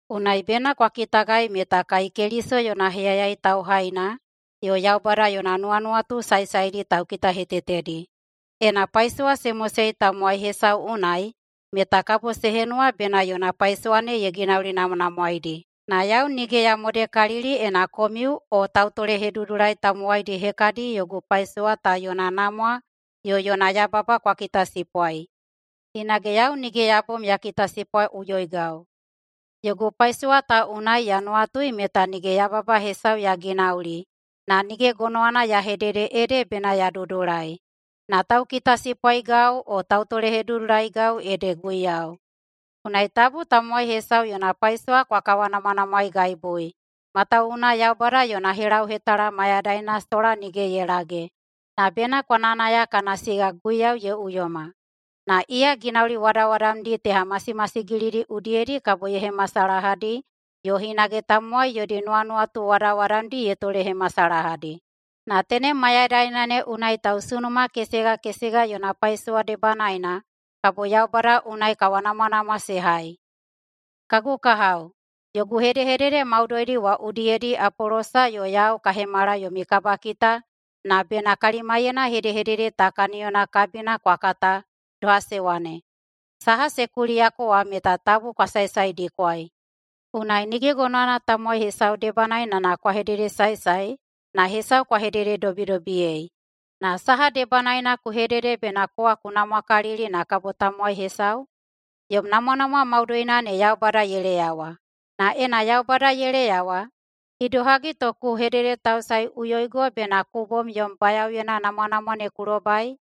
Unai bena kwa kitagai meta kai Keliso yona heyayai tauhaina yo Yaubada yona nuwanuwatu saesaedi taukitahetetedi. Ena paisowa se mosei tamowai hesau unai meta kabo se henuwa bena yona paisowa ne ye ginaulinamwanamwaeidi. Na yau nige ya modekalili ena komiu o tautolehedudulai tamowaidi hekadi yogu paisowa ta yona namwa yo yona yababa kwa kitasipwai, hinage yau nige ya bom ya kitasipwaiꞌuyoigau. Yogu paisowa ta unai ya nuwatui meta nige yababa hesau ya ginauli, na nige gonowana ya hedede ede bena ya dudulai. Na taukitasipwaigau yo tautolehedudulaigau ede Guiyau. Unai tabu tamowai hesau yona paisowa kwa kawanamwanamwaeigaibui, matawuwuna Yaubada yona helauhetala mayadaina sola nige ye lage, na bena kwa nayanaya kana siga Guiyau ye uyoma. Na iya ginauli wadawadamdi teha masimasigilidi udiyedi kabo ye hemasalahadi yo hinage tamowai yodi nuwanuwatu wadawadamdi ye tolehemasalahadi. Na tenem mayadaina ne unai tausunuma kesega kesega yona paisowa debanaena kabo Yaubada unai kawanamwanamwa se hai. Kagu kahao, yogu hedehedede maudoidi wa udiyedi Apolosa yo yau ka hemala yomi kabakita na bena kalimaiyena hedehedede ta kaniyona kabina kwa kata, doha se wane, “Saha se kuliyako wa meta tabu kwa saesaedikwai.” Unai nige gonowana tamowai hesau debanaena na kwa hededesaesae, na hesau kwa hedededobidobiyei. Na saha debanaena ku hedede bena kowa ku namwakalili na kabo tamowai hesau? Yom namwanamwa maudoina ne Yaubada ye leyawa. Na ena Yaubada ye leyawa, idohagi to ku hededetausaeꞌuyoigo bena ku bom yom bayaoyena namwanamwa ne ku lobai?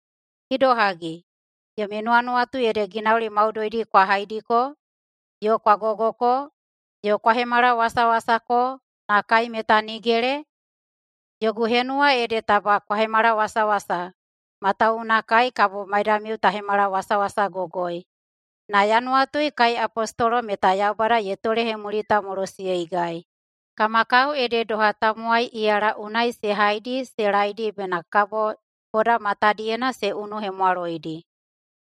Idohagi, yomi nuwanuwatu ede ginauli maudoidi kwa haidiko, yo kwa gogoko, yo kwa hemalawasawasako, na kai meta nigele? Yogu henuwa ede taba kwa hemalawasawasa, matawuwuna kai kabo maidamiu ta hemalawasawasagogoi. Na ya nuwatui kai apostolo meta Yaubada ye tolehemulitamolosiyeigai. Kama kao ede doha tamowai iyala unai se haidi se laeidi bena kabo boda matadiyena se unuhemwaloidi.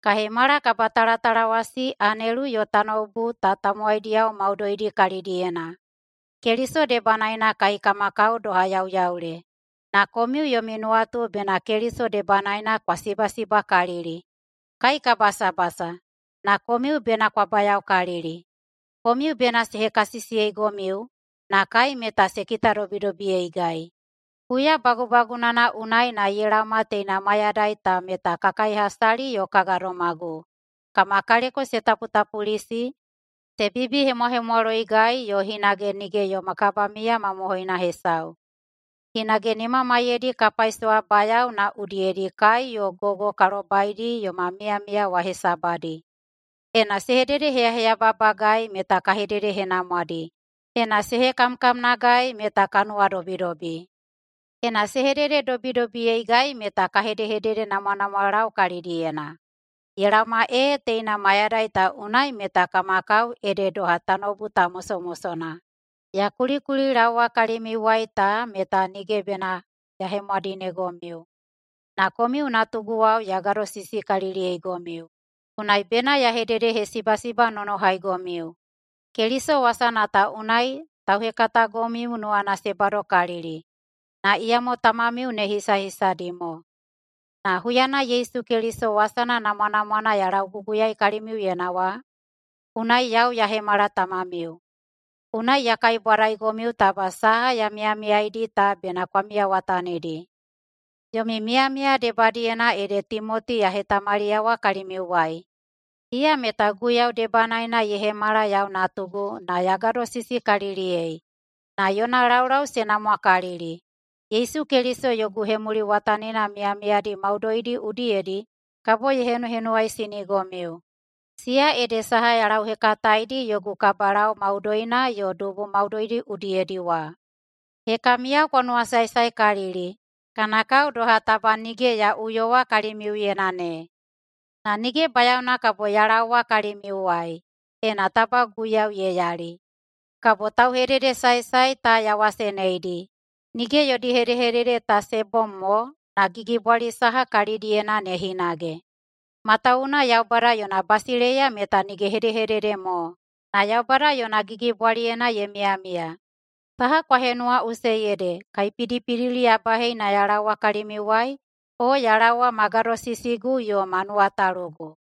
Ka hemala kabatalatalawasi anelu yo tanoubu ta tamowaidiyao maudoidi kalidiyena. Keliso debanaena kai kama kao doha yauyaule, na komiu yomi nuwatu bena Keliso debanaena kwa sibasibakalili. Kai ka basabasa, na komiu bena kwa bayaokalili. Komiu bena se hekasisiyeigomiu, na kai meta se kitadobidobiyeigai. Huya bagubagunana unai na ye laoma teina mayadai ta meta ka kaihasali yo ka gadomagu, kama kaleko se taputapulisi, se bibihemwahemwaloigai yo hinage nige yoma kabamiya mamohoina hesau. Hinage nimamaiyedi ka paisowabayao na udiyedi kai yo gogo ka lobaidi yoma miyamiya wa hesabadi. Ena se hededeheyababagai meta ka hededehenamwadi. Ena se hekamkamnagai meta ka nuwadobidobi. Ena se hedededobidobiyeigai meta ka hededenamwanamwalau kalidiyena. Ye laoma ee teina mayadai ta unai meta kama kao ede doha tanoubu ta mosomosona. Ya kulikulilaowa kalimiuwai ta meta nige bena ya hemwadinegomiu. Na komiu natuguwao ya gadosisikaliliyeigomiu, unai bena ya hededehesibasibanonohaigomiu. Keliso wasana ta unai tauhekatagomiu nuwana se badokalikalili, na iyamo tamamiu ne hisahisadi mo. Na huyana Yesu Keliso wasana namwanamwana ya lauguguyaei kalimiuyena wa, unai yau ya hemala tamamiu. Unai ya kaibwadaigomiu taba saha ya miyamiyaidi ta bena kwa miyawatanidi. Yomi miyamiya debadiyena ede Timoti ya hetamaliyawa kalimiuwai. Iya meta Guiyau debanaena ye hemala yau natugu na ya gadosisikaliliyei, na yona laulau se namwakalili. Yesu Keliso yogu hemuliwatanina miyamiyadi maudoidi udiyedi kabo ye henuhenuwaisinigomiu. Siya ede saha ya lauhekataedi yogu kabalau maudoina yo dubu maudoidi udiyedi wa. Hekamiyao kwa nuwasaesaekalili, kana kao doha taba nige ya uyowa kalimiuyena ne. Na nige bayaona kabo ya laowa kalimiuwai, ena taba Guiyau ye yali. Kabo tauhededesaesae ta ya waseneidi, nige yodi hedehedede ta se bom mo, na gigibwali saha kalidiyena ne hinage. Matawuwuna Yaubada yona basileiya meta nige hedehedede mo, na Yaubada yona gigibwaliyena ye miyamiya. Saha kwa henuwaꞌusei ede, kaipidipidili ya bahei na ya laowa kalimiuwai? O ya laowa ma gadosisigu yo ma nuwatalugu?